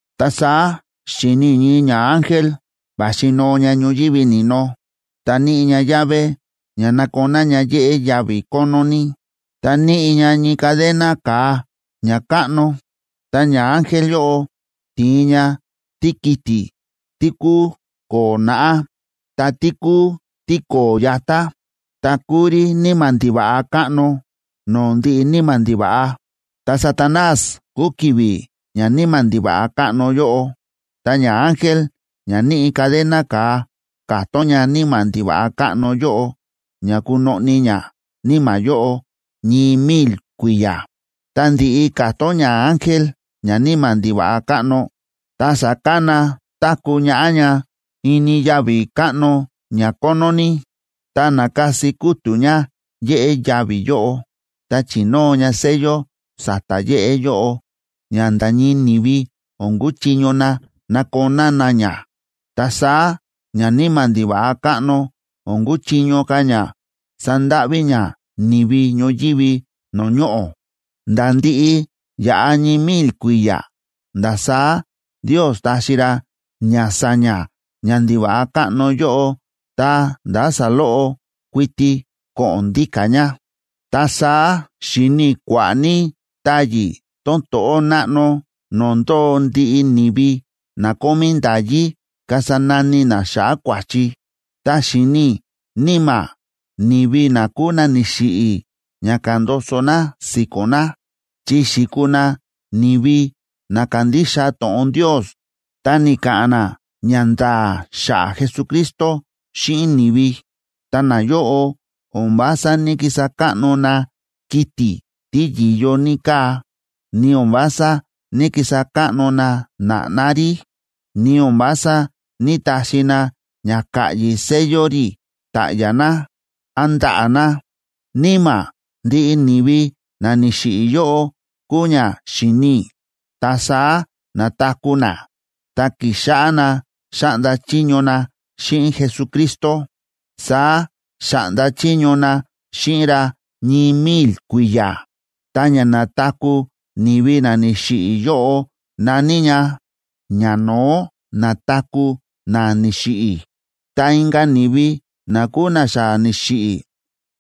Ta saá xi̱ni i̱ ñii ñaángel, va̱xi noo ña ñoyívi ni̱no, ta níꞌi ña llave ña nakoná ña yéꞌé yavi̱ kónó ní, ta níꞌi ña ñii cadena ka̱a ña káꞌno. Ta ñaángel yóꞌo ti̱in ña tíkiti̱ tí kúu ko̱o̱ naꞌá, ta tí kúu tíko̱o̱ yatá, ta kúu rí níma̱ ndiva̱ꞌa káꞌno no̱o̱ ndiꞌi níma̱ ndiva̱ꞌa, ta Satanás kúu ki̱vi̱ ñaníma̱ ndiva̱ꞌa káꞌno yóꞌo. Ta ñaángel ña níꞌi cadena ka̱a, ka̱tón ñaníma̱ ndiva̱ꞌa káꞌno yóꞌo ña kunoꞌni ñaníma̱ yóꞌo ñii mil kui̱ya̱. Tá ndi̱ꞌi ka̱tón ñaángel ñaníma̱ ndiva̱ꞌa káꞌno, ta sa̱kana táku̱ ñaꞌá ña ini yavi̱ káꞌno ña kónó ní, ta na̱kasi kútu̱ ña yéꞌé yavi̱ yóꞌo, ta chi̱nóo ña sello sa̱ta̱ yéꞌé yóꞌo, ña nda̱ ñii ni̱vi o̱n kuchiño na nakoná na ña. Ta saá ñaníma̱ ndiva̱ꞌa káꞌno o̱n kuchiño ka̱ ña sandáꞌví ña ni̱vi ñoyívi no̱o̱ ñoꞌo̱, nda̱ ndiꞌi yaꞌa ñii mil kui̱ya̱. Nda̱ saá Ndios taxi ra ña sa̱ña̱ ñandiva̱ꞌa káꞌno yóꞌo ta ndá saloꞌo kuiti ko̱ꞌo̱n ndíka̱ ña. Ta saá xi̱ni i̱ kua̱ꞌa̱ ní táyi̱ tón to̱ꞌó náꞌno no̱o̱ ndóo ndiꞌi ni̱vi na kómí nda̱yí kasa nani na xa̱ꞌa̱ kua̱chi. Ta xi̱ni̱ i̱ níma̱ ni̱vi na kúu na ni̱xiꞌi̱ ña ka̱ndoso na si̱ko̱n na, chi xi̱kuu na ni̱vi na kándixa to̱ꞌon Ndios ta ni̱ka̱ꞌa̱n na ñanda̱a̱ xa̱ꞌa̱ Jesucristo xíꞌin ni̱vi. Ta nayóꞌo o̱n vása ní‑kisa káꞌno na kiti̱ tí yi̱yo ní káa, ni o̱n vása ní‑kisa káꞌno na na̱ꞌná rí, ni o̱n vása ní‑taxi na ña ka̱ꞌyi̱ sello rí ta̱ꞌya̱ na, án ndaꞌa̱ na. Níma̱ ndiꞌi ni̱vi na ni̱xiꞌi̱ yóꞌo kúu ña xi̱ni i̱, ta saá na̱taku̱ na ta ki̱xáꞌá na xáꞌnda chiño na xíꞌin Jesucristo. Saá xa̱ꞌnda chiño na xíꞌin ra ñii mil kui̱ya̱. Ta ña na̱taku̱ ni̱vi na ni̱xiꞌi̱ yóꞌo na̱ní ña “ña no̱ó na̱taku̱ na ni̱xiꞌi̱.” Ta inka̱ ni̱vi na kúu na xa ni̱xiꞌi̱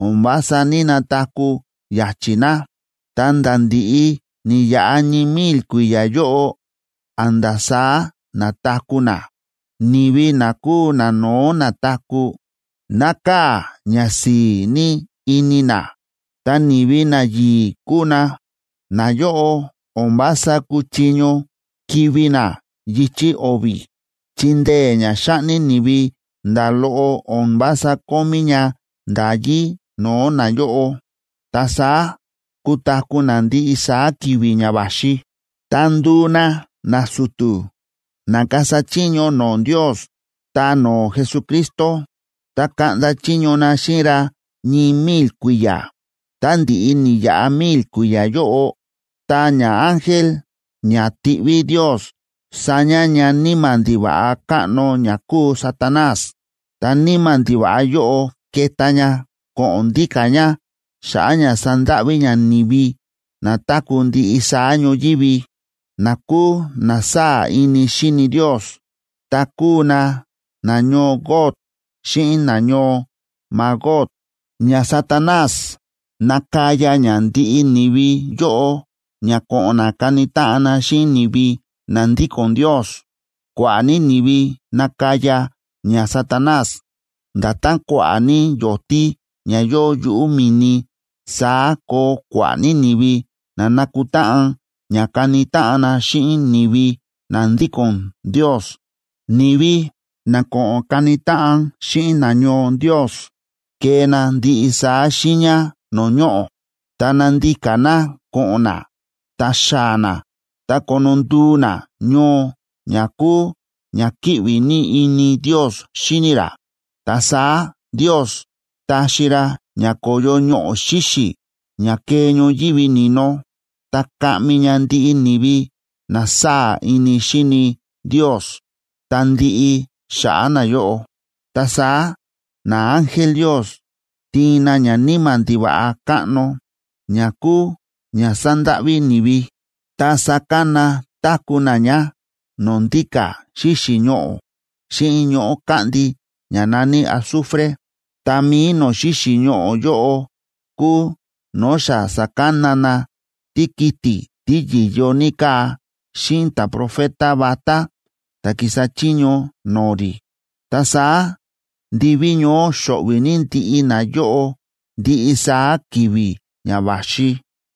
o̱n vása ní‑nataku̱ ya̱chi̱ na, ta̱nda̱ ndi̱ꞌi ni̱yaꞌa ñii mil kui̱ya̱ yóꞌo, a̱nda̱ saá na̱taku̱ na. Ni̱vi na kúu nano̱ó na̱taku̱, nákaa̱ ñasi̱i̱ ní ini na, ta ni̱vi nayi̱i̱ kúu na. Nayóꞌo o̱n vása kúchiño kivi̱ na yichi̱ o̱vi̱, chi ndee̱ ña xáꞌni ni̱vi nda̱ loꞌo o̱n vása kómí ña nda̱yí no̱o̱ nayóꞌo. Ta saá kutaku̱ na ndiꞌi saá ki̱vi̱ ña va̱xi, ta nduu na nasu̱tu̱, na kasa chiño no̱o̱ Ndios ta no̱o̱ Jesucristo, ta kaꞌnda chiño na xíꞌin ra ñii mil kui̱ya̱. Tá ndi̱ꞌi ni̱yaꞌa mil kui̱ya̱ yóꞌo, ta ñaángel ña tiꞌví Ndios sa̱ña̱ ñaníma̱ ndiva̱ꞌa káꞌno ña kúu Satanás. Ta níma̱ ndiva̱ꞌa yóꞌo keta ña ko̱ꞌo̱n ndíka̱ ña xa̱ꞌa̱ ña sandáꞌví ña ni̱vi na táku̱ ndiꞌi saá ñoyívi, na kúu na sáa̱ ini xíni Ndios, ta kúu na nañoo Gog xíꞌin nañoo Magog. ÑaSatanás nakaya ña ndiꞌi ni̱vi yóꞌo ña ko̱ꞌo̱n na kani táꞌan xíꞌin ni̱vi na ndíko̱n Ndios. Kua̱ꞌa̱ ní ni̱vi nakaya ñaSatanás; nda̱tán kua̱ꞌa̱ ní yo̱tí ña yóo yuꞌu̱ mi̱ni, saá koo kua̱ꞌa̱ ní ni̱vi na nakutáꞌan ña kani táꞌan na xíꞌin ni̱vi na ndíko̱n Ndios. Ni̱vi na ko̱ꞌo̱n kani táꞌan xíꞌin nañoo Ndios kee na ndiꞌi saá xiiña no̱o̱ ñoꞌo̱, ta nandika na ko̱ꞌo̱n na ta xaa̱ na ta kono nduu na ñoo ña kúu ña kíꞌvi ní ini Ndios xíni ra. Ta saá Ndios taxi ra ña ko̱yo ñoꞌo̱ xíxi̱ ña kee ñoyívi ni̱no, ta kaꞌmi ña ndiꞌi ni̱vi na sáa̱ ini xíni Ndios, ta ndiꞌi xa̱ꞌa̱ nayóꞌo. Ta saá naángel Ndios tiin na ñaníma̱ ndiva̱ꞌa káꞌno, ña kúu ña sa̱ndáꞌví ni̱vi, ta sakana táku̱ na ña no̱o̱ ndíka̱ xíxi̱ ñoꞌo̱ xíꞌin ñoꞌo̱ káꞌndi ña na̱ní azufre. Ta mi̱i no̱o̱ xíxi̱ ñoꞌo̱ yóꞌo kúu no̱o̱ xa sa̱kana na tíkiti̱ tí yi̱yo ní káa xíꞌin ta̱profeta vatá ta̱ ki̱sa chiño no̱o̱ rí. Ta saá ndiví ñoó xo̱ꞌvi̱ ní ndiꞌi nayóꞌo ndiꞌi saá ki̱vi̱ ña va̱xi.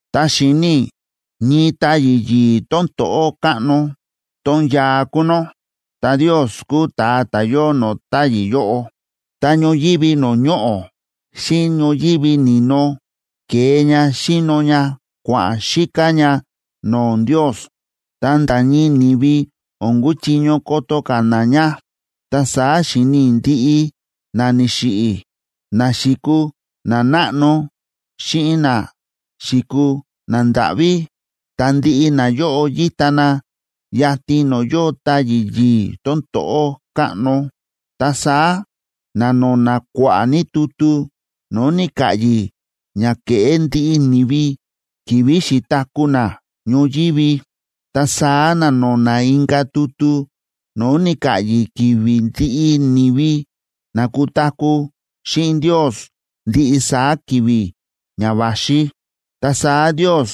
Ta xi̱ni i̱ ñii táyi̱ yi̱i̱ tón to̱ꞌó káꞌno, tón yaa kúu nó, ta Ndios kúu ta̱a ta̱ yóo no̱o̱ táyi̱ yóꞌo. Ta ñoyívi no̱o̱ ñoꞌo̱ xíꞌin ñoyívi ni̱no ke̱e ña xi̱no ña kua̱ꞌa̱n xíká ña no̱o̱ Ndios, ta nda̱ ñii ni̱vi o̱n kúchiño koto ka̱ na ña. Ta saá xi̱ni i̱ ndiꞌi na ni̱xiꞌi̱, na xi̱kuu nanáꞌno xíꞌin na xi̱kuu nandáꞌví. Ta ndiꞌi nayóꞌo yíta na yatin no̱o̱ yóo táyi̱ yi̱i̱ tón to̱ꞌó káꞌno. Ta saá na̱no̱na̱ kua̱ꞌa̱ ní tutu no̱o̱ ni̱ka̱ꞌyi̱ ña ke̱ꞌé ndiꞌi ni̱vi ki̱vi̱ xi̱taku̱ na ñoyívi. Ta saá na̱no̱na̱ inka̱ tutu no̱o̱ ni̱ka̱ꞌyi̱ ki̱vi̱ ndiꞌi ni̱vi na kutaku̱ xíꞌin Ndios ndiꞌi saá ki̱vi̱ ña va̱xi. Ta saá Ndios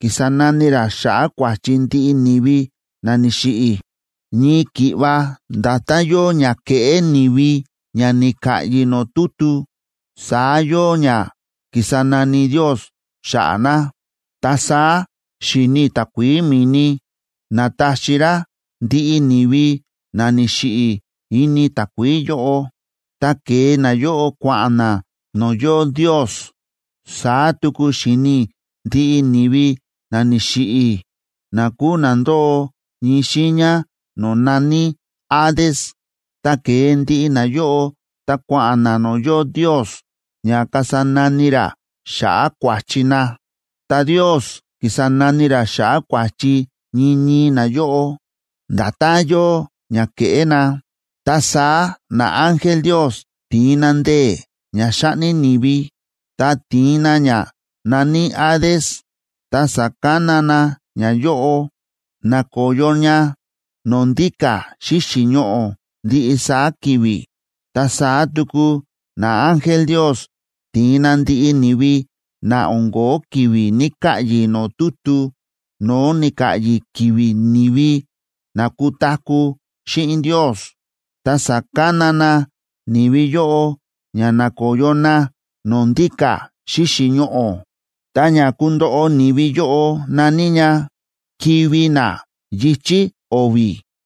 ki̱sa nani ra xa̱ꞌa̱ kua̱chi ndiꞌi ni̱vi na ni̱xiꞌi̱. Ñii ki̱ꞌva nda̱tán yóo ña ke̱ꞌé ni̱vi ña ni̱ka̱ꞌyi̱ no̱o̱ tutu, saá yóo ña ki̱sa nani Ndios xa̱ꞌa̱ na. Ta saá xi̱ni i̱ takuií mi̱ni na̱taxi rá ndiꞌi ni̱vi na ni̱xiꞌi̱ ini takuií yóꞌo, ta ke̱e nayóꞌo kua̱ꞌa̱n na no̱o̱ yóo Ndios. Saá tuku xi̱ni i̱ ndiꞌi ni̱vi na ni̱xiꞌi̱, na kúu na ndóo ñii xiiña no̱o̱ na̱ní Hades, ta ke̱e ndiꞌi nayóꞌo, ta kua̱ꞌa̱n na no̱o̱ yóo Ndios ña kasa nani ra xa̱ꞌa̱ kua̱chi na. Ta Ndios ki̱sa nani ra xa̱ꞌa̱ kua̱chi ñii ñii nayóꞌo, nda̱tán yóo ña ke̱ꞌé na. Ta saá naángel Ndios ti̱in na ndee̱ ña xáꞌni ni̱vi, ta ti̱in na ña na̱ní Hades, ta sa̱kana na ñayóꞌo, na̱koyo ña no̱o̱ ndíka̱ xíxi̱ ñoꞌo̱ ndiꞌi saá ki̱vi̱. Ta saá tuku naángel Ndios ti̱in na ndiꞌi ni̱vi na o̱n ko̱ó ki̱vi̱ ni̱ka̱ꞌyi̱ no̱o̱ tutu no̱o̱ ni̱ka̱ꞌyi̱ ki̱vi̱ ni̱vi na kutaku̱ xíꞌin Ndios, ta sa̱kana na ni̱vi yóꞌo ña nakoyo na no̱o̱ ndíka̱ xíxi̱ ñoꞌo̱. Ta ña kundoꞌo ni̱vi yóꞌo na̱ní “ña kivi̱ na yichi̱ o̱vi̱.”